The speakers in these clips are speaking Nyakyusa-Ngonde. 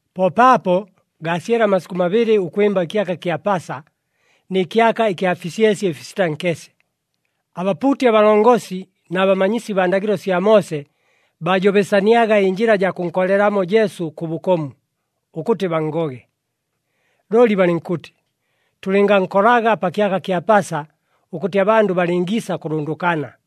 Po paapo, gaasyele amasikʉ mabɨlɨ ʉkwɨmba ɨkyaka kya Pasa, nɨ kyaka ɨkya fisyesye ɨfisita nkese. Abapuuti abalongosi na bamanyisi baa ndagɨlo sya Moose baajobesaniaga ɨnjɨla jaa kʉnkolelamo Jesu kʉ bʉkomu, ʉkʉtɨ banngoge. Looli balɨnkʉtɨ, “Tʉlɨngankolaga pa kyaka kya Pasa ʉkʉtɨ abandʉ balɨngiisa kʉlʉndʉkana.”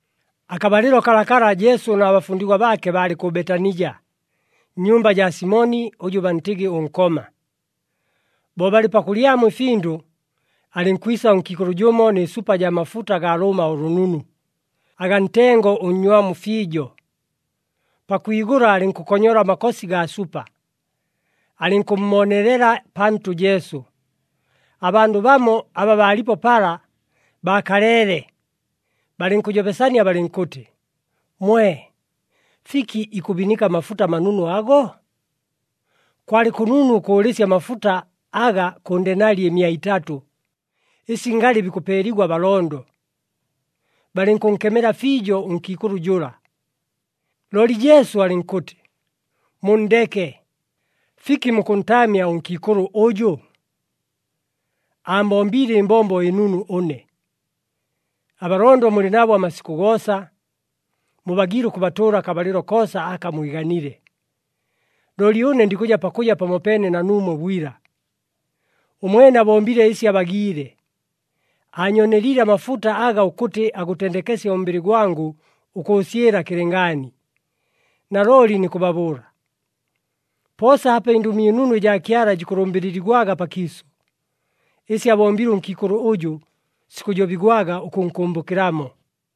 Akabalɨlo kalakala Jesu na bafundigwa baake baalɨ kʉ Betanija, nnyumba jaa Simoni, ʉjʉ bantɨgɨ ʉNkoma. Bo balɨ pakʉlyamo ɨfindʉ, alɨnkwisa ʉnkiikʉlʉ jʉmo nɨ supa jaa mafuta agaa lʉʉma ʉlʉnunu, agaa ntengo ʉnnywamu fiijo. Pakwigʉla, alɨnkʉkonyola amakosi gaa supa, alɨnkʉmmoonelela pantʉ Jesu. Abandʉ bamo aba baalipo pala, baakaleele, balɨnkʉjobesania balɨnkʉtɨ, “Mwe! Fiki ikʉbinika amafuta amanunu ago? Kwalɨ kʉnunu ʉkʉʉlɨsya amafuta aga kʉ ndenali ɨmia itatʉ, ɨsi ngalɨ bikʉpeeligwa abalondo!” Balɨnkʉnkemela fiijo ʉnkiikʉlʉ jʉla. Looli Jesu alɨnkʉtɨ, “Munndeke! Fiki mukʉntaamya ʉnkiikʉlʉ ʉjʉ! Aambombiile ɨmbombo ɨnunu ʉne. Abalondo mulɨ nabo amasikʉ goosa, mubagiile ʉkʉbatʉʉla akabalɨlo koosa aka mwiganile. Looli ʉne ndikʉja pakʉja pamopeene na nuumwe bwila. Ʉmwene abombile ɨsi abagiile, aanyooneliile amafuta aga ʉkʉtɨ agʉtendekesye ʉmbɨlɨ gwangʉ ʉkʉʉsyɨla kɨlɨngaani. Nalooli nikʉbabʉʉla, poosa apa ɨNdʉmi ɨNunu ɨjaa Kyala jikʉlʉmbɨlɨligwaga pakiisʉ, ɨsi abombile ʉnkiikʉlʉ ʉjʉ sikʉjobigwaga ʉkʉnkʉmbʉkɨlamo.”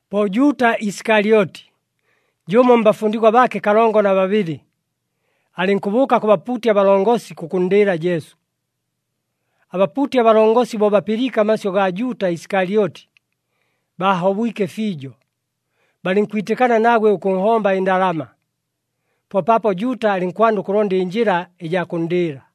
Po Juuta Isikalyoti, jʉmo mbafundigwa baake kalongo na babɨlɨ, alɨnkʉbʉʉka kʉ bapuuti abalongosi kʉkʉnndɨɨla Jesu. Abapuuti abalongosi bo bapɨliike amasyʉ gaa Juuta Isikalyoti, baahobwike fiijo. Balɨnkwitɨkana nagwe ʉkʉnhomba ɨndalama. Po paapo Juuta alɨnkwanda ʉkʉlonda ɨnjɨla ɨjaa kʉnndɨɨla.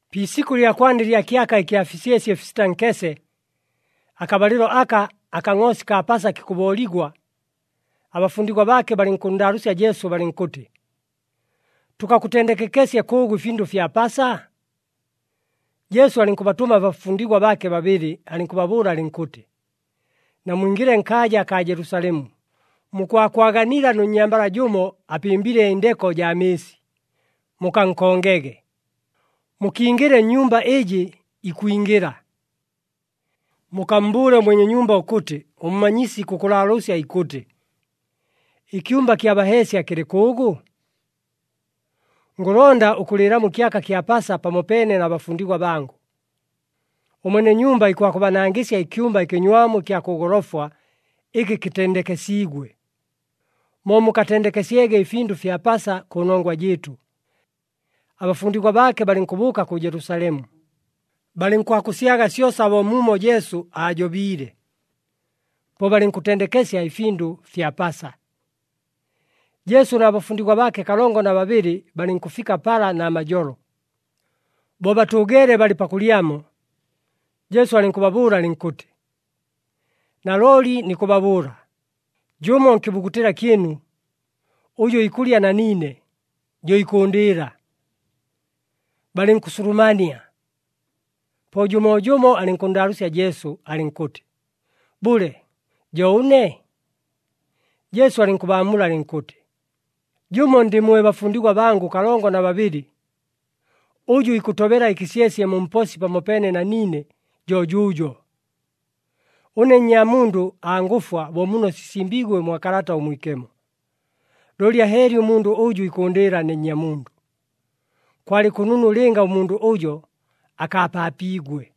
Pi isikʉ ɨlya kwanda ɨlya kyaka ɨkya fisyesye ɨfisita nkese, akabalɨlo aka akangʼoosi kaa Pasa kikʉbooligwa, abafundigwa baake balɨnkʉnndaalʉʉsya Jesu balɨnkʉtɨ, “Tʉkakʉtendekekesye kʉʉgʉ ɨfindʉ fya Pasa?” Jesu alɨnkʉbatʉma abafundigwa baake babɨlɨ alɨnkʉbabʉʉla alɨnkʉtɨ, “Namwingɨle nkaaja akaa Jelusalemu, mukwakwaganila nʉ nnyambala jʉmo, apɨmbile ɨndeko jaa mɨɨsi. Mukankongege. Mukingɨle nnyumba ɨjɨ ikwingɨla. Mukammbʉʉle ʉmwene nyumba ʉkʉtɨ ʉMmanyisi ikʉkʉlaalʉʉsya ikʉtɨ, ‘Ɨkyumba kya baheesya kɨlɨ kʉʉgʉ? Ngʉlonda ʉkʉlɨɨlamo ɨkyaka kya Pasa pamopeene na bafundigwa bangʉ.’ Ʉmwene nyumba ikwakʉbanangɨsya ɨkyumba ɨkɨnywamu ɨkya kʉ golofwa ɨkɨ kɨtendekesiigwe, mo mukatendekesyege ɨfindʉ fya Pasa kʉnongwa jɨɨtʉ.” Abafundigwa baake balɨnkʉbʉʉka kʉ Jelusalemu, balɨnkwakʉsyaga syosa bo muumo Jesu aajobiile. Po balɨnkʉtendekesya ɨfindʉ fya Pasa. Jesu na bafundigwa baake kalongo na babɨlɨ balɨnkʉfika pala namajolo. Bo batʉʉgeele balɨ pakʉlyamo, Jesu alɨnkʉbabʉʉla alɨnkʉtɨ, “Nalooli nikʉbabʉʉla, jʉmo nkɨbugutɨla kyɨnu, ʉjʉ ikʉlya na niine, jo ikʉʉndɨɨla.” Balɨnkʉsulumania, po jʉmoojʉmo alɨnkʉnndaalʉʉsya Jesu, alɨnkʉtɨ, “Bʉle, jo ʉne?” Jesu alɨnkʉbaamula alɨnkʉtɨ, “Jʉmo ndɨ mwe bafundigwa bangʉ kalongo na babɨlɨ, ʉjʉ ikʉtobela ɨkɨsyesye mu mposi pamopeene na niine jo jʉjʉʉjo. Ʉne Nnyamundʉ angʉfwa bo muno sisimbiigwe mwa Kalata ʉMwikemo. Looli ahɨɨli ʉmundʉ ʉjʉ ikʉʉndɨɨla ne Nnyamundʉ. Kwalɨ kʉnunu lɨnga ʉmundʉ ʉjo akaapaapiigwe.”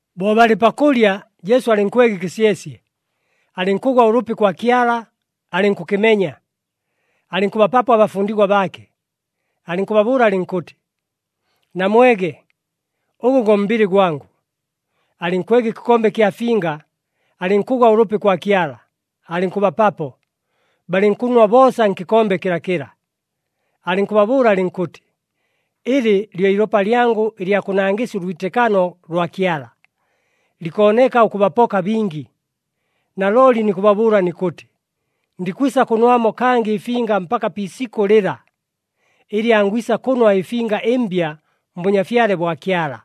Bo balɨ pakʉlya, Jesu alɨnkwega ɨkɨsyesye, alɨnkʉgwa ʉlʉpi kwa Kyala, alɨnkʉkɨmenya, alɨnkʉbapapo abafundigwa baake, alɨnkʉbabʉʉla alɨnkʉtɨ, “Namwege, ʉgʉ go mbɨlɨ gwangʉ.” Alɨnkwega ɨkɨkombe ɨkya finga, alɨnkʉgwa ʉlʉpi kwa Kyala, alɨnkʉbapapo, balɨnkʉnwa boosa nkɨkombe kɨlakɨla. Alɨnkʉbabʉʉla alɨnkʉtɨ, “Ɨlɨ lyo ilopa lyangʉ ɨlya kʉnangɨsya ʉlwitɨkano lwa Kyala. Likooneka ʉkʉbapoka bingi. Nalooli nikʉbabʉʉla nikʉtɨ, ndikwisa kʉnwamo kangɨ ɨfinga mpaka pi isikʉ lɨla, ɨlɨ angwisa kʉnwa ɨfinga ɨmbya mBʉnyafyale bwa Kyala.”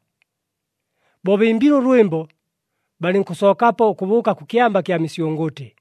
Bo bɨmbile ʉlwɨmbo, balɨnkʉsookapo ʉkʉbʉʉka kʉ Kyamba kya Misyʉngʉtɨ.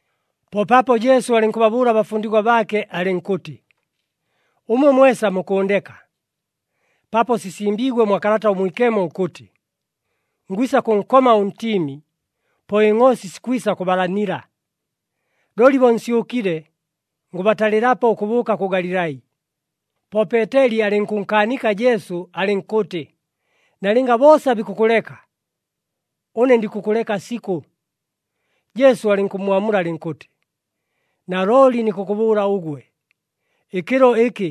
Po paapo Jesu alɨnkʉbabʉʉla abafundigwa baake alɨnkʉtɨ, “Ʉmwe mwesa mukʉʉndeka, paapo sisimbiigwe mwa Kalata ʉMwikemo ʉkʉtɨ, ‘Ngwisa kʉnkoma ʉntiimi, po ɨngʼoosi sikwisa kʉbalanila.’ Looli bo nsyʉkile, ngʉbatalɨlapo ʉkʉbʉʉka kʉ Galilai.” Po Peeteli alɨnkʉnkaanika Jesu alɨnkʉtɨ, “Nalɨnga boosa bikʉkʉleka, ʉne ndikʉkʉleka sikʉ!” Jesu alɨnkʉmmwamula alɨnkʉtɨ, “Nalooli nikʉkʉbʉʉla ʉgwe, ɨkɨlo ɨkɨ,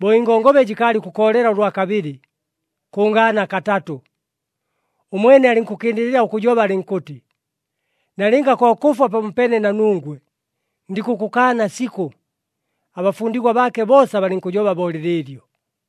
bo ɨngongobe jɨkaalɨ ʉkʉkoolela ʉlwa kabɨlɨ, kʉngaana katatʉ.” Ʉmwene alɨnkʉkɨndɨlɨla ʉkʉjoba alɨnkʉtɨ, “Nalɨnga ko kʉfwa pamopeene na nungwe, ndikʉkʉkaana sikʉ!” Abafundigwa baake boosa balɨnkʉjoba bo lɨlɨɨlyo.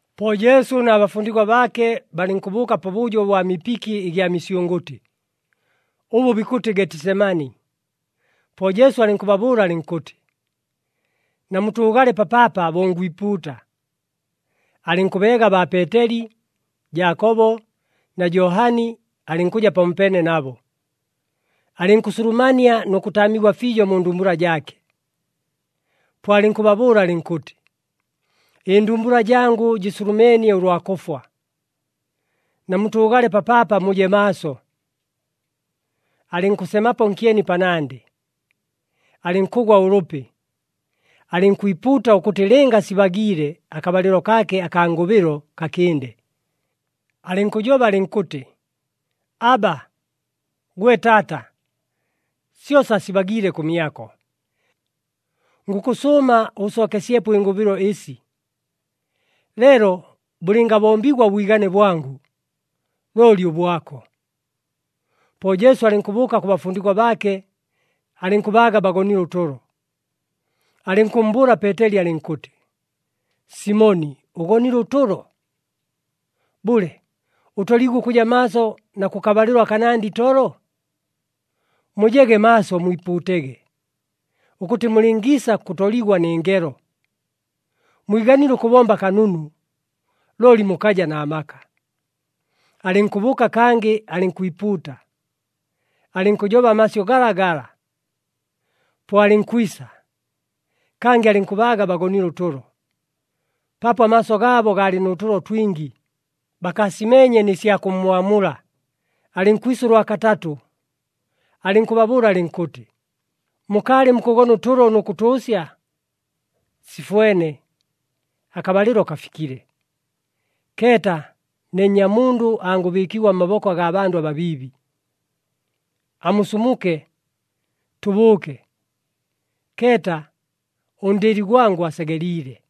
Po Jesu na bafundigwa baake balɨnkʉbʉʉka pabʉjo ʉbwa mipiki ɨgya misyʉngʉtɨ, ʉbʉ bikʉtɨ Getisemani. Po Jesu alɨnkʉbabʉʉla alɨnkʉtɨ, “Namutʉʉgale papaapa bo ngwipuuta.” Alɨnkʉbeega baa Peeteli, Jaakobo na Johani alɨnkʉja pamopeene nabo, alɨnkʉsulumania nʉ kʉtaamigwa fiijo mu ndumbula jaake. Po alɨnkʉbabʉʉla alɨnkʉtɨ, “Ɨndumbula jangʉ jɨsulumeenie ʉlwa kʉfwa. Namutʉʉgale papaapa, muje maaso.” Alɨnkʉsemapo nkyeni panandɨ, alɨnkʉgwa ʉlʉpi, alɨnkwipuuta ʉkʉtɨ lɨnga sibagiile akabalɨlo kaake akaa ngʉbɨlo kakɨnde. Alɨnkʉjoba alɨnkʉtɨ, “Abba, gwe Taata! Syosa sibagiile kʉmyako. Ngʉkʉsʉʉma ʉʉsookesyepo ɨngʉbɨlo ɨsi. Leelo bʉlɨngabombigwa ʉbwigane bwangʉ, looli ʉbwako.” Po Jesu alɨnkʉbʉʉka kʉ bafundigwa baake, alɨnkʉbaaga bagonile ʉtʉlo. Alɨnkʉmmbʉʉla Peeteli alɨnkʉtɨ, “Simoni ʉgonile ʉtʉlo? Bʉle, ʉtoliigwe ʉkʉja maaso na kʉkabalɨlo akanandɨ itolo? Mujege maaso mwipuutege, ʉkʉtɨ mulɨngiisa kʉtoligwa nɨ ngelo. Mwiganile ʉkʉbomba kanunu, looli mukaja na maka.” Alɨnkʉbʉʉka, kangɨ alɨnkwipuuta, alɨnkʉjoba amasyʉ galagala. Po alɨnkwisa, kangɨ alɨnkʉbaaga bagonile ʉtʉlo, paapo amaaso gaabo gaalɨ nʉ tʉlo twingi, bakaasimeenye nɨ sya kʉmmwamula. Alɨnkwisa ʉlwa katatʉ, alɨnkʉbabʉʉla alɨnkʉtɨ, “Mukaalɨ mukʉgona ʉtʉlo nʉ kʉtʉʉsya? Sifwene! Akabalɨlo kafikile. Keeta, ne Nnyamundʉ angʉbɨɨkigwa mmaboko agaa bandʉ ababiibi. Amusumuke! Tʉbʉʉke. Keeta, ʉndɨɨli gwangʉ asegeliile.”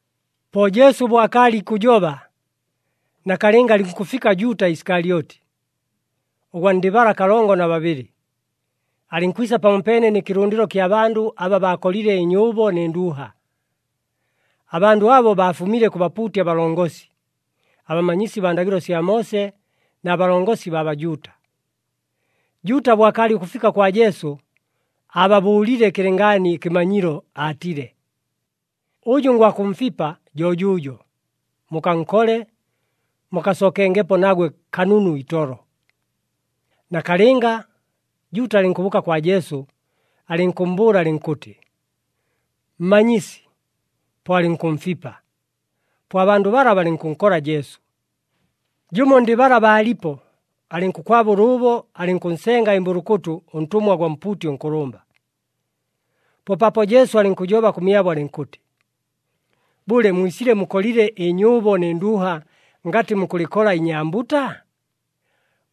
Po Jesu bo akaalɨ ikʉjoba, nakalɨnga alɨnkʉfika Juuta Isikalyoti, ʉgwa ndɨ bala kalongo na babɨlɨ, alɨnkwisa pamopeene nɨ kɨlʉndɨlo kya bandʉ aba baakolile ɨnyʉʉbo nɨ nduuha. Abandʉ abo baafumile kʉ bapuuti abalongosi, abamanyisi baa ndagɨlo sya Moose na balongosi baa Bajuuta. Juuta bo akaalɨ ʉkʉfika kwa Jesu, aababʉʉlile kɨlɨngaani ɨkɨmanyilo, aatile, “Ʉjʉ ngwakʉmfipa, jo jʉʉjo, mukankole, mukasookengepo nagwe kanunu itolo.” Nakalɨnga, Juuta alɨnkʉbʉʉka kwa Jesu, alɨnkʉmmbʉʉla alɨnkʉtɨ, “Mmanyisi!” Po alɨnkʉmfipa. Po abandʉ bala balɨnkʉnkola Jesu. Jʉmo ndɨ bala baalipo, alɨnkʉkwaba ʉlʉʉbo, alɨnkʉnsenga ɨmbʉlʉkʉtʉ ʉntʉmwa gwa mpuuti ʉnkʉlʉmba. Po paapo Jesu alɨnkʉjoba kʉmyabo alɨnkʉtɨ, “Bʉle, mwisile mukolile ɨnyʉʉbo nɨ nduuha ngatɨ mukʉlɨkola inyambuta?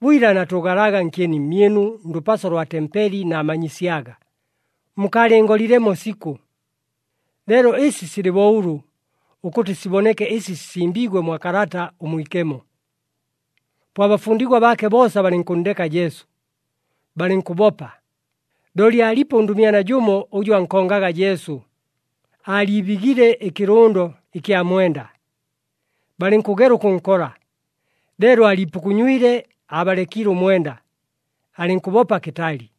Bwila naatʉʉgalaga nkyeni mmyɨnu ndʉpaso lwa tempeli naamanyisyaga, mukaalɨngolilemo sikʉ! Leelo ɨsi silɨ bo ʉlʉ, ʉkʉtɨ siboneke ɨsi sisimbiigwe mwa Kalata ʉMwikemo.” Po abafundigwa baake boosa balɨnkʉnndeka Jesu, balɨnkʉbopa. Looli aalipo ʉndʉmyana jʉmo ʉjʉ ankongaga Jesu, aaliibigile ɨkɨlʉndo ɨkya mwenda. Balɨnkʉgela ʉkʉnkola, leelo aaliipukunywile, aabalekiile ʉmwenda, alɨnkʉbopa kɨtali.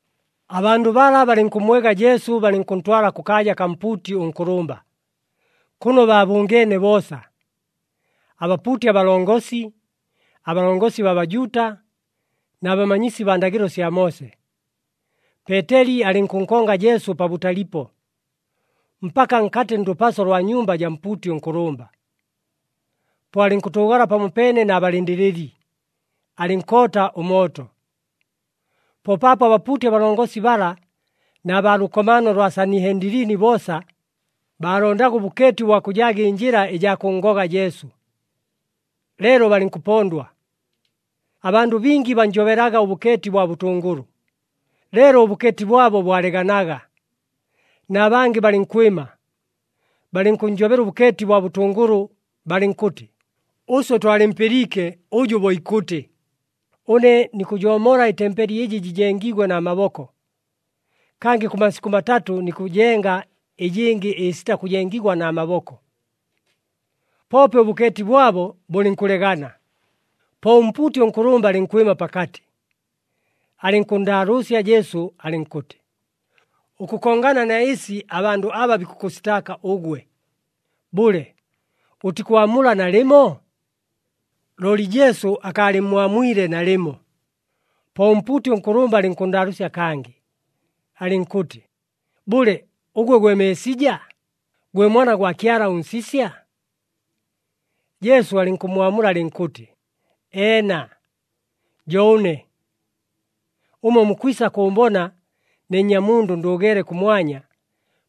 Abandʉ bala balɨnkʉmmwega Jesu balɨnkʉntwala kʉkaaja kaa mpuuti ʉnkʉlʉmba, kʉno baabʉngeene boosa, abapuuti abalongosi, abalongosi baa Bajuuta na bamanyisi baa ndagɨlo sya Moose. Peeteli alɨnkʉnkonga Jesu pabʉtalipo, mpaka nkatɨ ndʉpaso lwa nnyumba jaa mpuuti ʉnkʉlʉmba. Po alɨnkʉtʉʉgala pamopeene na balɨndɨlɨli, alɨnkoota ʉmooto. Po paapo abapuuti abalongosi bala na baa lʉkomaano lwa Sanihendilini boosa, baalondaga ʉbʉkeeti ʉbwa kʉjaaga ɨnjɨla ɨjaa kʉnngoga Jesu. Leelo balɨnkʉpondwa. Abandʉ bingi bannjobelaga ʉbʉkeeti bwa bʉtʉngʉlʉ, leelo ʉbʉkeeti bwabo bwaleganaga. Na bangɨ balɨnkwɨma, balɨnkʉnnjobela ʉbʉkeeti bwa bʉtʉngʉlʉ, balɨnkʉtɨ, “Ʉswe twalɨmpɨliike ʉjʉ bo ikʉtɨ, ‘Ʉne nikʉjoomola ɨtempeli ɨjɨ jɨjengiigwe na maboko. Kangɨ kʉ masikʉ matatʉ nikʉjenga ɨjɨngɨ ɨsita kʉjengigwa na maboko.’” Poope ʉbʉkeeti bwabo bʉlɨnkʉlegana. Po ʉmpuuti ʉnkʉlʉmba alɨnkwɨma pakatɨ, alɨnkʉnndaalʉʉsya Jesu alɨnkʉtɨ, “Ʉkʉkongana na ɨsi abandʉ aba bikʉkʉsitaaka ʉgwe, bʉle ʉtikwamula nalɨmo?” Looli Jesu akaalɨmmwamwile nalɨmo. Po ʉmpuuti ʉnkʉlʉmba alɨnkʉnndaalʉʉsya kangɨ, alɨnkʉtɨ, “Bʉle, ʉgwe gwe Meesija, gwe Mwana gwa Kyala ʉNsisya?” Jesu alɨnkʉmmwamula alɨnkʉtɨ, “Eena, jo ʉne. Ʉmwe mukwisa kʉʉmbona ne Nnyamundʉ ndʉʉgeele kʉmwanya,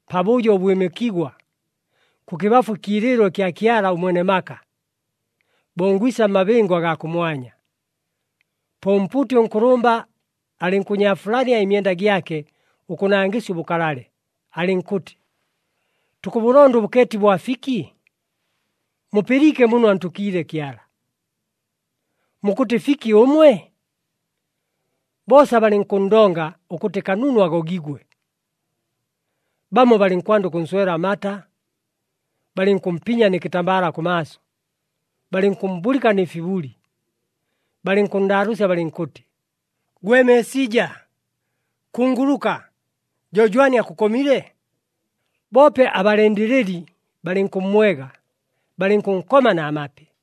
pabʉjo ʉbwɨmɨkigwa, kʉkɨbafu ɨkiilɨɨlo ɨkya Kyala ʉMwene maka, bo ngwisa mmabɨngo agaa kʉmwanya.” Po ʉmpuuti ʉnkʉlʉmba alɨnkʉnyaafulania ɨmyenda gyake ʉkʉnangɨsya ʉbʉkalale, alɨnkʉtɨ, “Tukʉbʉlonda ʉbʉkeeti bwa fiki? Mupɨliike muno antʉkiile Kyala! Mukʉtɨ fiki ʉmwe?” Boosa balɨnkʉnndonga ʉkʉtɨ kanunu agogigwe. Bamo balɨnkwanda ʉkʉnswela amata, balɨnkʉmpinya nɨ kɨtambala kʉmaaso, balɨnkʉmmbulɨka nɨ fibuli, balɨnkʉnndaalʉʉsya balɨnkʉtɨ, “Gwe Meesija, kunguluka! Jo jwani akʉkomile?” Boope abalɨndɨlɨli balɨnkʉmmwega, balɨnkʉnkoma na mapi.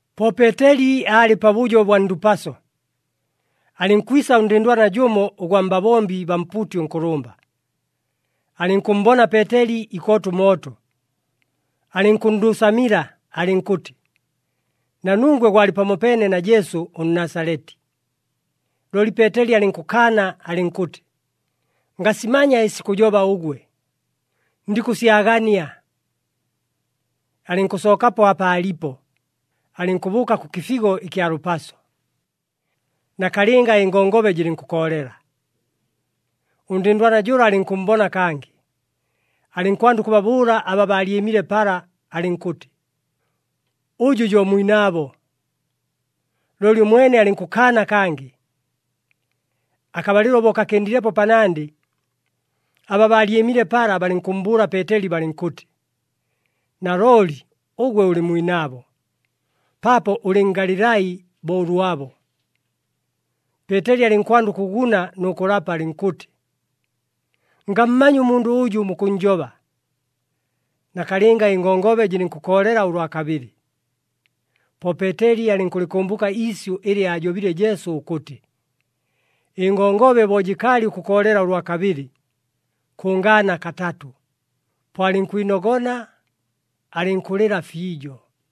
Po Peeteli aalɨ pabʉjo bwa ndʉpaso. Alɨnkwisa ʉndɨndwana jʉmo ʉgwa mbabombi baa mpuuti ʉnkʉlʉmba, alɨnkʉmmbona Peeteli ikoota ʉmooto. Alɨnkʉnndʉʉsamila alɨnkʉtɨ, “Na nungwe gwalɨ pamopeene na Jesu ʉNnasaleti.” Looli Peeteli alɨnkʉkaana alɨnkʉtɨ, “Ngasimanya ɨsi kʉjoba ʉgwe, ndikʉsyagania.” Alɨnkʉsookapo apa aalipo, alɨnkʉbʉʉka kʉ kɨfigo ɨkya lʉpaso. Nakalɨnga ɨngongobe jɨlɨnkʉkoolela. Ʉndɨndwana jʉla alɨnkʉmmbona kangɨ, alɨnkwanda ʉkʉbabʉʉla aba baalyɨmile pala alɨnkʉtɨ, “Ʉjʉ jo mwinaabo.” Looli ʉmwene alɨnkʉkaana kangɨ. Akabalɨlo bo kakɨndilepo panandɨ, aba baalyɨmile pala balɨnkʉmmbʉʉla Peeteli balɨnkʉtɨ, “Nalooli ʉgwe ʉlɨ mwinaabo, paapo ʉlɨ Ngalilai bo ʉlwabo.” Peeteli alɨnkwanda ʉkʉguna nʉ kʉlapa, alɨnkʉtɨ, “Ngammanya ʉmundʉ ʉjʉ mukʉnnjoba.” Nakalɨnga ɨngongobe jɨlɨnkʉkoolela ʉlwa kabɨlɨ. Po Peeteli alɨnkʉlɨkʉmbʉka iisyʉ ɨlɨ aajobile Jesu ʉkʉtɨ, “Ɨngongobe bo jɨkaalɨ ʉkʉkoolela ʉlwa kabɨlɨ, kʉngaana katatʉ.” Po alɨnkwinogona, alɨnkʉlɨla fiijo.